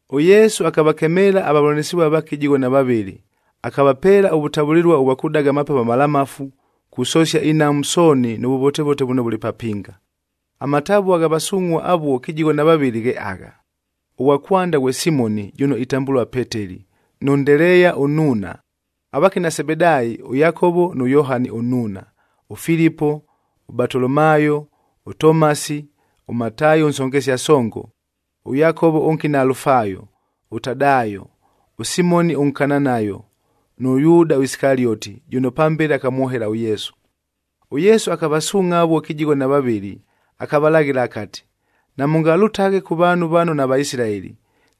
ɄYesu akavakemeela avavʉlanɨsɨvua vaake kɨjigho na vavɨlɨ, akavapeela ʉvʉtavʉlɨlua ʉvwa kʉdaga amapepo amalamafu, kusosia inhamu sooni nʉ vʉvotevote vʉno vʉlɨ papinga. Amatavua gha vasungʼhuaa avuo kɨjigho na vavɨlɨ ghe agha: ʉghwa kwanda ghwe Simoni, jʉno itambʉlua Peteli, nʉ Ndeleeya ʉnnuuna, avakina Sebedaayi ʉYakovo nʉ Yohani ʉnnuuna, ʉFilipo, ʉBatolomaayo, ʉTomasi, ʉMataayi ʉnsongesia songo, ʉYakovo ʉnkina Alufaayo, ʉTadaayo, ʉSimoni ʉNkananayob nʉ Yuuda Isikalioti, jʉno pambele akamwohela ʉYesu. ɄYesu akavasuungʼha avuo kɨjigho na vavɨlɨ, akavalaghɨla akati, “Namʉngalʉtaghe kʉ vaanhu vano naVaisilaeli,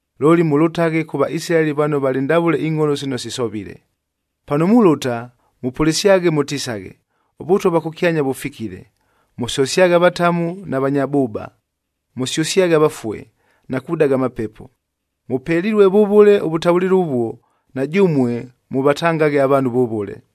Looli mʉlʉtaghe kʉ Vaisilaeli vano valɨ ndavʉle ingʼholo sino sisovile. Pano mulʉta, mʉpʉlɨsyaghe mʉtisaghe, ‘ɄVʉtwa vwa kʉkyanya vʉfikile.’ Mʉsosyaghe avatamu na vanya bʉʉba, mʉsyʉsyaghe avafue, na kudaga amapepo. Mʉpelilue vʉvʉle ʉvʉtavʉlɨlua ʉvuo, na jʉmue mʉvatangaghe avaanhu vʉvʉle.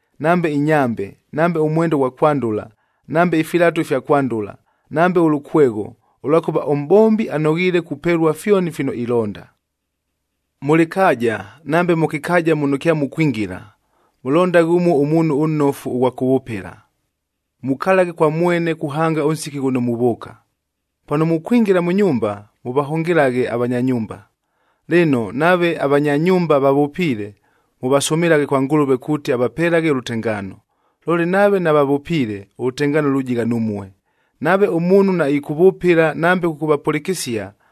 nambe inyambe, nambe ʉmwenda ʉghwa kwandʉla, nambe ifilatu ifya kwandʉla, nambe ʉlʉkwegho, ʉlwakʉva ʉmʼbombi anoghiile kupelua fyoni fino ilonda. “Mʉ lɨkaaja nambe mʉ kɨkaaja muno kyamukwingila, mʉlondaghe ʉmuo ʉmuunhu ʉnnofu ʉghwa kʉvʉpɨla. Mukalaghe kwa mwene kuhanga ʉnsiki ghʉno muvʉʉka. Pano mukwingila mʉ nyumba, mʉvahʉngɨlaghe avanya nyumba. Lɨno, nave avanya nyumba vavʉpiile, mʉvasʉmɨlaghe kwa Ngʉlʉve kuuti avapelaghe ʉlʉtengaano. Looli nave navavʉpiile, ʉlʉtengaano lujigha numue. Nave ʉmuunhu naɨkʉvʉpɨla nambe kʉkʉvapʉlɨkɨsia,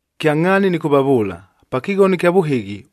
Kyangʼhaani nɨkʉvavʉʉla, pa kɨghono ɨkya vʉhɨghi,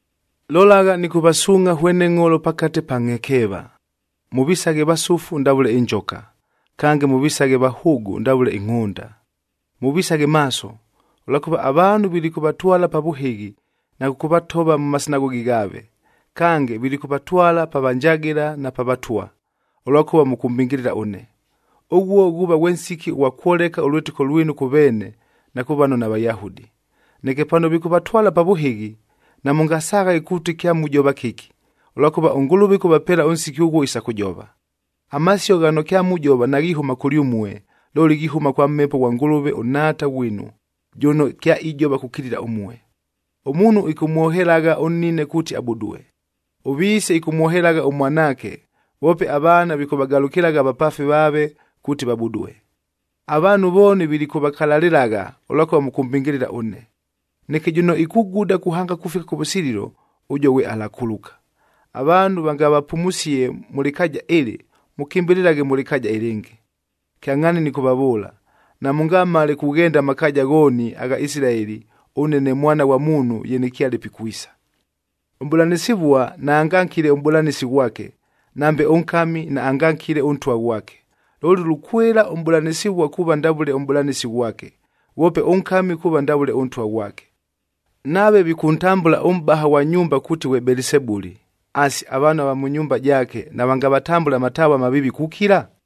“Lolagha, nɨkʉvasuungʼha hwene ngʼholo pakate pa ngʼhekeeva. Mʉvisaghe vasʉfu ndavʉle ɨnjoka, kange mʉvisaghe vahʉʉgʉ ndavʉle ɨngʼhʉnda. Mʉvisaghe maaso, ʉlwakʉva avaanhu vilikʉvatwala pa vʉhɨghi, na kʉkʉvatova mʉ masinagogi ghaave. Kange, vilikʉvatwala pa vanjagɨla na pa vatwa, ʉlwakʉva mʉkʉmbɨngɨlɨla ʉne. Ʉghuo ghuuva ghwe nsiki ʉghwa kwoleka ʉlwɨtɨko lwinu kʉ veene na kʉ vano naVayahudi. Neke pano vikʉvatwala pa vʉhɨghi, namʉngasaghaghe kuuti kyamujova kɨki, ʉlwakʉva ʉNgʉlʉve ɨkʉvapeela ʉnsiki ʉghuo isa kʉjova. Amasio ghano kyamujova naghihʉma kʉlyʉmue, looli ghihʉma kwa Mhepo ghwa Ngʉlʉve ʉNhaata ghwinu, jʉno kyaijova kukilila ʉmue. “Ʉmuunhu ɨkʉmwohelagha ʉnnine kuuti abudue. Ʉviise ɨkʉmwohelagha ʉmwanaake, voope avaana vikʉvagalʉkɨlagha avapaafi vaave kuuti vabudue. Avaanhu vooni vilikʉvakalalɨlagha, ʉlwakʉva mʉkʉmbɨngɨlɨla ʉne. Neke jʉno ikuguda kuhanga kufika kʉvʉsililo, ʉjuo ghwe alakuluka. Avaanhu vangavapumusie mʉ lɨkaaja ɨlɨ, mʉkɨmbɨlɨlaghe mʉ lɨkaaja ɨlɨngɨ. Kyangʼhaani nɨkʉvavʉʉla, namʉngamale kughenda amakaaja ghooni agha Isilaeli ʉne ne Mwana ghwa Muunhu ye nɨkyale pikwisa. “Ʉmʼbʉlanɨsɨvua naangankile ʉmʼbʉlanɨsi ghwake, nambe ʉnkami naangankile ʉntwa ghwake. Looli lukwɨla ʉmʼbʉlanɨsɨvua kuuva ndavʉle ʉmʼbʉlanɨsi ghwake, ghwope ʉnkami kuuva ndavʉle ʉntwa ghwake. Nave vikʉntambʉla ʉmʼbaha ghwa nyumba kuuti ghwe Belisebuli,f asi, avaanhu ava mʉ nyumba jaake navangavatambʉle amatavua amaviivi kukila?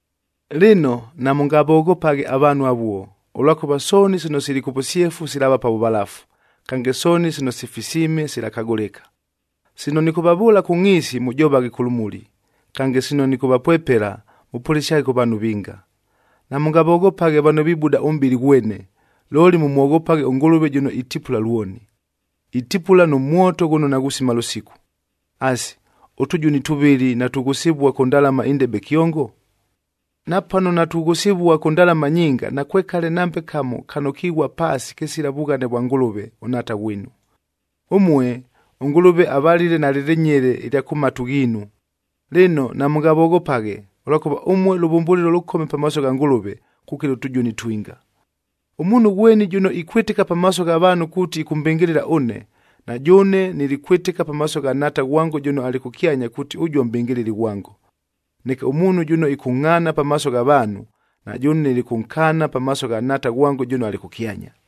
“Lɨno, namʉngavoghopaghe avaanhu avuo, ʉlwakʉva sooni sino sili kʉ vʉsyefu silaava pa vʉvalafu, kange sooni sino sifisiime silakagʉlɨka. Sino nɨkʉvavʉʉla kʉ ngʼhiisi, mʉjovaghe kʉ lʉmuli. Kange, sino nɨkʉvapwepela, mʉpʉlɨsyaghe kʉ vaanhu vinga. Namʉngavoghopaghe vano vibuda ʉmʼbɨlɨ ghwene, looli mʉmwoghopaghe ʉNgʉlʉve jʉno itipula lwoni. Itipula nʉ mwoto ghʉno naghusima lʉsiku. Asi, ʉtʉjuni tʉvɨlɨ natughʉsɨvua kʉ ndalama indebe kyongo? Napano natughʉsɨvua kʉ ndalama nyinga, nakwekale nambe kamo kano kighua paasi kɨsila vughane vwa Ngʉlʉve, ʉNhaata ghwinu. Ʉmue, ʉNgʉlʉve avalile nalɨ lɨnyele ɨlya kʉ matu ghiinu. Lɨno, namʉngavoghopaghe, ʉlwakʉva ʉmue lʉvʉmbʉlɨlo lʉkome pamaaso gha Ngʉlʉve kukila ʉtʉjuni ʉtwinga. “Ʉmuunhu ghweni jʉno ikwɨtɨka pamaaso gha vaanhu kuuti ɨkʉmbɨngɨlɨla ʉne, na jʉʉne nilikwɨtɨka pamaaso gha Nhaata ghwango jʉno alɨ kʉkyanya kuuti ʉjuo mʼbɨngɨlɨli ghwango. Neke ʉmuunhu jʉno ɨkʉngʼhaana pamaaso gha vaanhu, na jʉʉne nilikʉnkaana pamaaso gha Nhaata ghwango jʉno alɨ kʉkyanya.”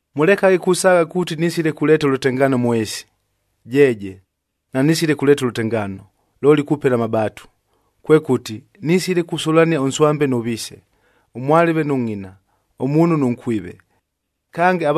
“Mʉlekaghe kusaagha kuuti nisile kuleeta ʉlʉtengaano mʉ ɨɨsi. Jeeje, nanisile kuleeta ʉlʉtengaano, looli kupela amabaatu. Kwekʉti, nisile kusʉlania ʉnswambe nʉ viise, ʉmwalɨve nʉ ngʼina, ʉmuunhu nʉ nkwive. Kange,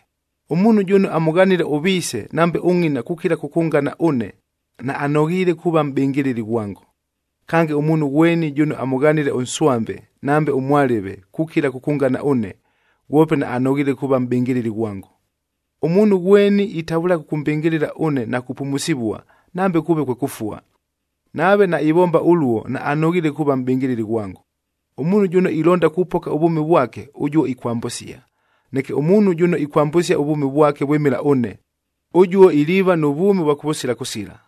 Ʉmuunhu jʉno amʉghanile ʉviise nambe ʉngʼina kukila kʉkʉngana ʉne, naanoghiile kuuva mʼbɨngɨlɨli ghwango. Kange, ʉmuunhu ghweni jʉno amʉghanile ʉnswambe, nambe ʉmwalɨve, kukila kʉkʉngana ʉne, ghwope naanoghiile kuuva mʼbɨngɨlɨli ghwango. Ʉmuunhu ghweni itavʉlaghe kʉkʉmbɨngɨlɨla ʉne na kupumusivua, nambe kʉʉve kwe kʉfua. Nave naivomba ʉluo naanoghiile kuuva mʼbɨngɨlɨli ghwango. Ʉmuunhu jʉno ilonda kupoka ʉvwʉmi vwake, ʉjuo ikwambʉsia, neke ʉmuunhu jʉno ikwambʉsia ʉvwʉmi vwake vwɨmɨla ʉne, ʉjuo iliiva nʉ vwʉmi ʉvwa kʉvʉsila kʉsila.”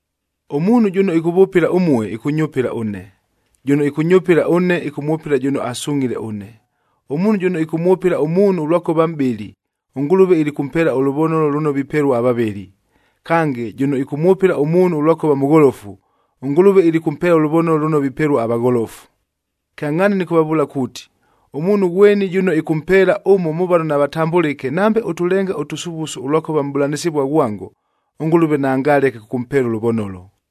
“Ʉmuunhu jʉno ɨkʉvʉpɨla ʉmue, ɨkʉnyʉpɨla ʉne, jʉno ɨkʉnyʉpɨla ʉne, ɨkʉmwʉpɨla jʉno asungʼhile ʉne. Ʉmuunhu jʉno ɨkʉmwʉpɨla ʉmuunhu ʉlwakʉva mʼbɨli, ʉNgʉlʉve ilikʉmpeela ʉlʉvonolo lʉno vipelua avavɨli. Kange, jʉno ɨkʉmwʉpɨla ʉmuunhu ʉlwakʉva mʉgholofu, ʉNgʉlʉve ilikʉmpeela ʉlʉvonolo lʉno vipelua avagholofu. Kyangʼhaani nɨkʉvavʉʉla kuuti, ʉmuunhu ghweni jʉno ɨkʉmpeela ʉmo mʉ vano navatambʉlɨke nambe ʉtʉlenga ʉtʉsuvusu ʉlwakʉva mʼbʉlanɨsɨvua ghwango, ʉNgʉlʉve naangaleke kʉkʉmpeela ʉlʉvonolo.”